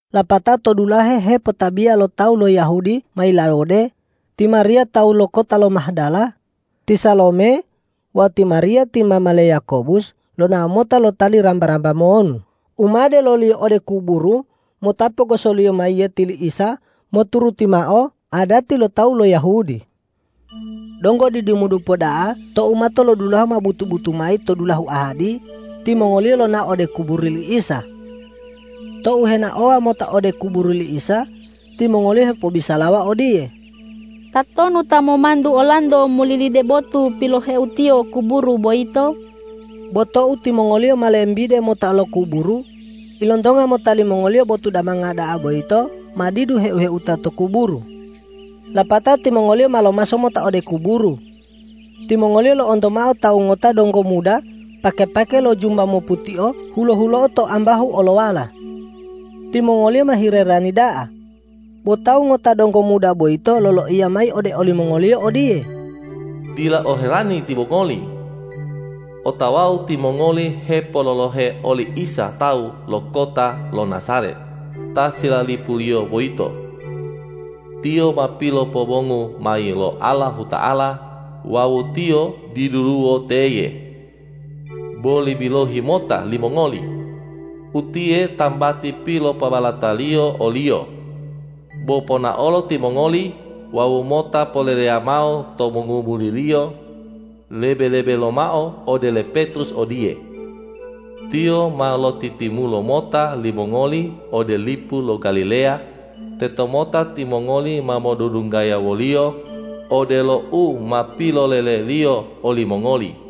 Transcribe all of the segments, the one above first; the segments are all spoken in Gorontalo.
Lapatao tou dulahe hepotabiya lo tawu lo Yahudi ma yilawode, ti Mariya tawu lo kota lo Mahdala, ti Salome wawu ti Mariya ti mama le Yakobus lonao mota lotali ramba-ramba monu u ma deloliyo ode kuburu mota pogosoliyo mayiyeti li Isa moturuti mao adati lo tawu lo Yahudi. Donggo didimodupa da'a tou matolodulahu ma butu-butu mayi to dulahu ahadi, timongoliyo lonao ode kuburu li Isa. Tou henaowa mota ode kuburu li Isa, timongoliyo hepobisalawa odiye,”Tatonu ta ma momantu olanto molilide botu piloheutiyo kuburu boyito?” Bo tou timongoliyo ma lembide mota lo kuburu, ilontonga mota limongoliyo botu damanga da'a boyito ma didu heu-heuta to kuburu. Lapatao timongoliyo ma lomaso mota ode kuburu. Timongoliyo lo'onto mao tawu ngota donggo muda pake-pake lo jumba moputio hulo-hulo'o to ambahu olowala. Timongoliyo ma hilerani da'a. Bo tawu ngota donggo muda boyito loloiya mayi ode olimongoliyo odiye,”Dila oherani timongoli! Otawau timongoli hepololohe oli Isa tawu lo kota lo Najaret, ta silalipuliyo boyito. Tiyo ma pilopobongu mayi lo Allahuta'ala wawu Tiyo diduluwo teye. Boli bilohi mota limongoli! Utiye tambati pilopobalataliyo o-Liyo. Bo ponaolo timongoli wawu mota poleleya mao to mongomuri-Liyo, lebe-lebe lomao ode le Petrus odiye: Tiyo ma lotitimulo mota limongoli ode lipu lo Galileya; tetomota timongoli ma modudunggaya wo-Liyo, odelo u ma pilolele-Liyo olimongoli.”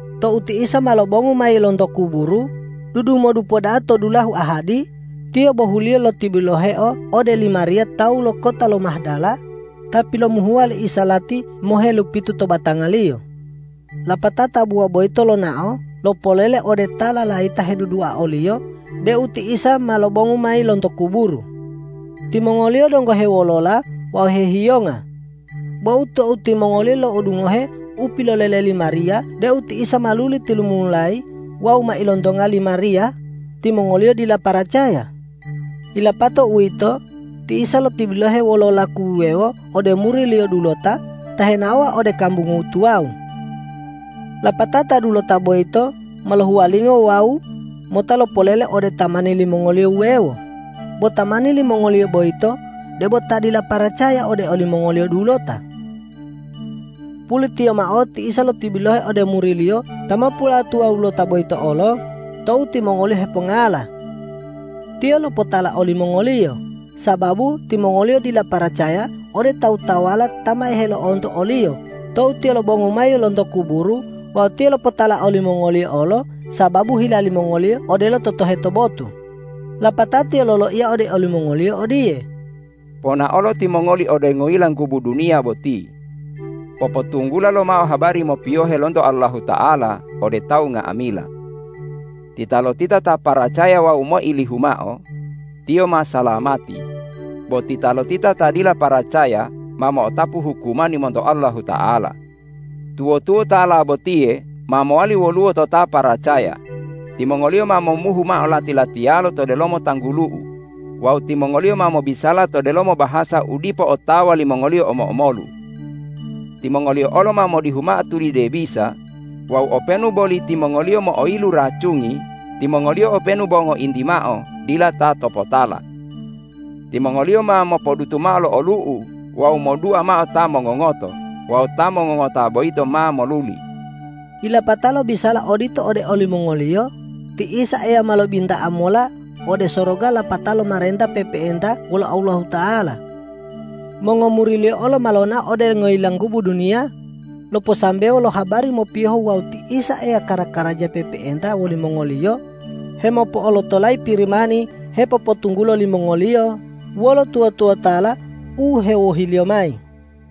Tou ti Isa ma lobongu mayi lonto kuburu, dudumodupa da'a to dulahu ahadi, Tiyo bohuliyo lotibiloheo ode li Mariya tawu lo kota lo Mahdala, ta pilomuhuwa li Isa lati mohelupitu to batangaliyo. Lapatao tabuwa boyito lonao lopolele ode ta lalayita hedudua o-Liyo deu ti Isa ma lobongu mayi lonto kuburu. Timongoliyo donggo hewolola wawu hehiyonga. Bo tou timongoliyo lo'odungohe u pilolele li Mariya deu ti Isa ma luli tilumumulayi wawu ma ilontonga li Mariya, timongoliyo dila paracaya. Yilapato uwito, ti Isa lotibilohe wolo laku wuwewo ode muri-Liyo dulota ta henaowa ode kambungu tuwawu. Lapatao ta dulota boyito ma lohuwalingo wawu mota lopolele ode tamani limongoliyo wuwewo, bo tamani limongoliyo boyito debo ta dila paracaya ode olimongoliyo dulota. Pulitiyo mao ti Isa lotibilohe ode muri-Liyo ta mopulatuwawulota boyito olo tou timongoliyo hepongala. Tiyo lopotala olimongoliyo, sababu timongoliyo dila paracaya ode tawu-tawuwala ta ma helo'onto o-Liyo tou Tiyo lobongu mayi lonto kuburu wawu Tiyo lopotala olimongoliyo olo sababu hila limongoliyo odelo totoheto botu. Lapatao Tiyo loloiya ode olimongoliyo odiye,”Ponaolo timongoli ode ngoyilanggubu duniya boti. Popotunggula lomao habari mopiyohe lonto Allahuta'ala ode tawu nga'amila. Titalotita ta paracaya wawu moilihu mao, tiyo ma salamati; bo titalotita ta dila paracaya ma mo'otapu hukumani monto Allahuta'ala. Tuwo-tuwotala botiye ma mowali woluwo to ta paracaya: Timongoliyo ma momuhu mao lati-latiyalo to delomo tanggulu-U wawu timongoliyo ma mobisala to delomo bahasa u dipo otawa limongoliyo omo-omolu. Timongoliyo olo ma modihu mao tulide bisa wawu openu boli timongoliyo mo'oyilu racungi, timongoliyo openu bo ngointi mao dila ta topotala. Timongoliyo ma mopodutu mao lo olu'u wawu modua mao ta mongongoto wawu ta mongongota boyito ma moluli.” Yilapatao lobisala odito ode olimongoliyo, ti Isa Eya ma lobinta'a mola ode soroga lapatao lomarenta pe'epe'enta wolo Allahuta'ala. Mongomuri-Liyo olo ma lonao ode ngoyilanggubu duniya loposambewo lo habari mopiyohu wawu ti Isa Eya kara-karaja pe'epe'enta wolimongoliyo hemopo'olotolayi Pirimani hepopotunggulo limongoliyo wolo tuwo-tuwotala u hewohi-Liyo mayi.